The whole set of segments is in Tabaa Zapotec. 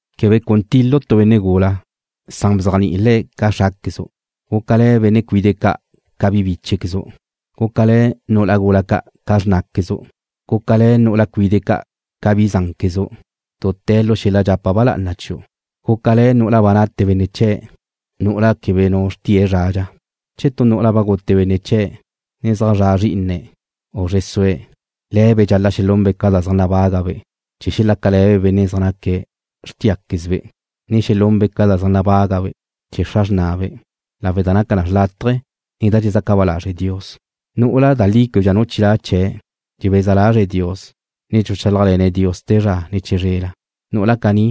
Quebe cun til-lu' tu benne' gula, san bzéajni'i le̱' ca xráquezu'. Gúcale̱ benne' cuide' ca' ca bi bíchequezu'. Gúcale̱ nu'ula gula ca' ca xrnáquezu'. Gúcale̱ nu'ula cuide' ca' ca bi zánquezu', dute̱ lu xel-la dxapa ba lá'ana chiu'. Gúcale̱ nu'ula ba nate benne' chee̱', nu'ula' quebe nu xrtie̱' zradxa. Che tu nu'ula ba gute benne' chee̱' ne zaj zra' zrí'ine̱', u zre sue̱', le̱be' dxal-la' xelunbe' ca da zaj nabágabe' chee̱ xelácale̱be' benne' zaj naca xrtíaquezbe', ne xelunbe' ca da zaj nabágabe' chee̱ xra xrnabe', lawe' da naca na xrlátaje, ne da dxezaca ba lazre' Dios. Nu'ula da li québedxa nu chilá' chee̱' dxebeza lazre̱' Dios, ne dxuchálajle̱ne̱' Dios te zra, ne chizrela. Nu'ula caní,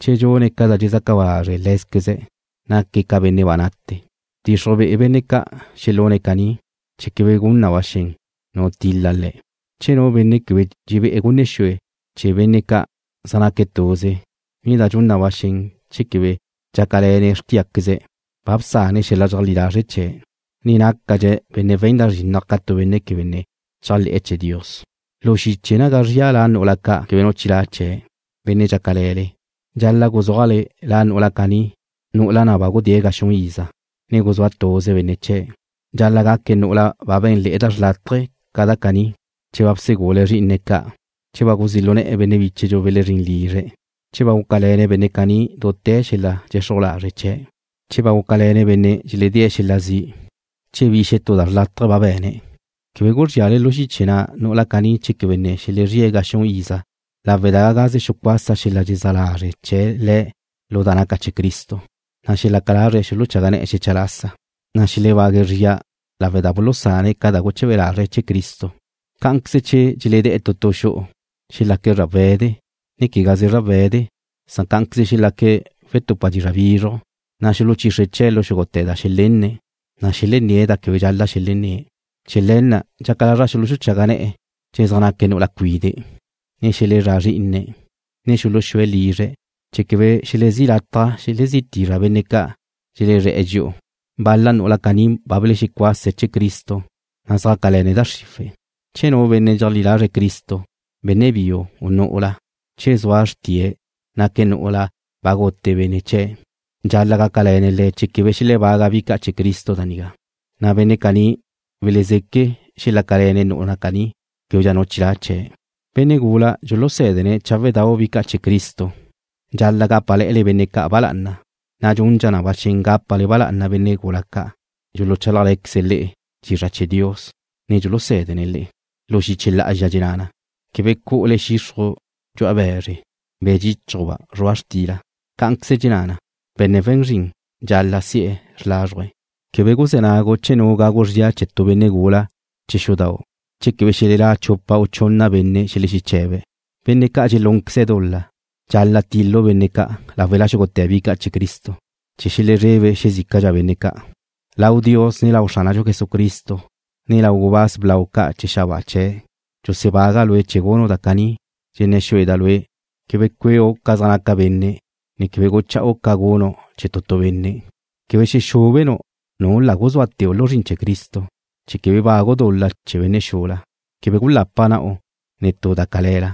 che dxune̱' ca da dxezaca ba lazre' lé̱queze̱', naque̱' ca benne' ba nate. Bdxixruj be'e benne' ca' xelune̱' caní, chee̱ quebe gun na ba xen nu til-la le̱'. Che nu benne' quebe dxebé'e̱ gunne xue chee̱ benne' ca' zaj naque̱' tuze, ne da dxun na ba xen che quebe dxácale̱ne̱' xrtíaqueze̱', ba bsane̱' xel-la dxeajlí lazre' chee̱', ne nácadxe̱' benne' we̱n da zrinnaj ca tu benne' quebe ne chéajle̱'e̱ chee̱ Dios. Lu xiche naga zria la nu'ula ca' quebe nu chilá' chee̱', benne' dxácale̱le, dxal-la' guzúajle la nu'ula caní, nu'ula na' ba gudée̱' ga xun iza, ne guzúa tuze benne' chee̱'. Dxal-la' gaque̱' nu'ula ba bé̱nle̱'e̱ da xrlátaje ca da caní: Che ba bsegule̱' zrí'ine̱' ca'. Che ba guzí' lu ne̱'e̱ benne' bíchedxu belezrín lizre̱'. Che ba gúcale̱ne̱' benne' caní dute̱ lu xel-la dxexruj lazre' chee̱'. Che ba gúcale̱ne̱' benne' dxedée̱' xel-la zi'. Che bi xetú da xrlátaje ba be̱ne̱'. Quebe guzríale lu xiche na' nu'ula caní che quebe ne xelezríe̱' ga xun iza lawe' da gagaze xucuasa xel-la dxelezá lazre' chee̱' le̱' lu da naca chee̱ Cristo, na' xelaca lazre̱' xuluchaga ne̱'e̱ xecha lasa, na' xelebague̱' zria lawe' da bulusane̱' ca da guleche̱be lazre̱' chee̱ Cristo. Cá'anqueze che dxeledé̱' tu tu xu'u, xelaque̱' zrawe̱de, ne quegaze zrawe̱de, san cá'anqueze xelaque̱' wetupa dizra' bizruj, na' xuluchixre chee̱' lu xúgute̱ da xelenne̱', ne xelenné̱' da quebe dxal-la' xelenné̱'. Chee̱ le̱ na' dxaca lazra' xuluxuchaga ne̱'e̱ che ne zaj naque' nu'ula cuide', ne xelezrá zrí'ine̱', ne xuluxúe̱' lizre̱', chee̱ quebe xelezí lataj xelezí tizra benne' ca' dxelezre̱'e̱ dxi'u. Bal-la nu'ula caní ba belexecuase̱' chee̱ Cristo, ne zjácale̱ne̱' da xriwe̱'. Che nu benne' dxeajlí lazre̱' Cristo, benne' biu, u nu'ula, che zua xrtie̱' naque̱' nu'ula ba gute benne' chee̱', dxal-la' gácale̱ne̱' le̱' chee̱ quebe xelebaga bi ca' chee̱ Cristo da nigá, na' benne' caní welezeque' xelácale̱ne̱' nu'ula caní québedxa nu chilá' chee̱'. Che zaj zra' benne' gula ca' dxulusédene̱' cháwedau' bi ca' chee̱ Cristo, dxal-la' gápale̱'e̱le benne' ca' ba lá'ana, na' dxundxa na ba xen gápale ba lá'ana benne' gula ca' dxuluchálajle̱queze̱' le'e dizra' chee̱ Dios, ne dxulusé̱dene̱' le'e. Lu xiche lá'azxa dxenná na: Quebe cu'ule xixruj dxu'a be̱zre, be̱ dxíchujba' zrua' xtila. Cá'anqueze dxenná na: Benne' we̱n zrin dxal-la' si'e̱ xrlázruje̱'. Quebe guzé̱ nagu' che nu gagu zria chee̱ tu benne' gula chee̱ xudau' che quebe xelelá' chupa u chunna benne' xelexeche̱be̱'. Benne' ca' dxelúnqueze̱' dul-la, dxal-la' til-lu' benne' ca' láwela xúgute̱ bi ca' chee̱ Cristo, chee̱ xelezrebe xezícadxa benne' ca'. Lau Dios, ne lau Xránadxu Jesucristo, ne lau gubáz blau ca' chee̱ xabáa chee̱', dxusebaga' lue' chee̱ gunu' da caní. Dxenné̱ xueda' lue' quebe cueu' ca zaj naca benne', ne quebe gucha'u ca gunu' chee̱ tu tu benne'. Quebe xexúbenu' nu la guzúateu' lu zrin chee̱ Cristo chee̱ quebe bagu' dul-la chee̱ benne' xula. Quebe gulapa na'u ne tu da cale̱la.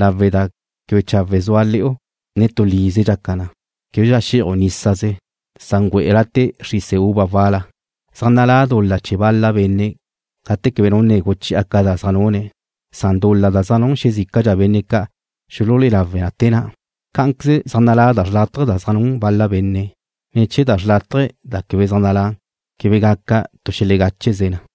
Lawe' da quebe chawe' zua le̱'u, ne tu lize dxaca na, québedxa xé'aju' nísaze, san güe'e late' xrise uva wal-la. Zaj nalá' dul-la chee̱ bal-la benne' gate quebe nu ne guchi'a ca da zaj nune̱', san dul-la da zaj nun xezícadxa benne' ca' xululé'e lawe na te na'. Cá'anqueze zaj nalá' da xrlátaje da zaj nun bal-la benne', ne che zra da xrlátaje da quebe zaj nalá', quebe gaca tu xelegáchequeze na.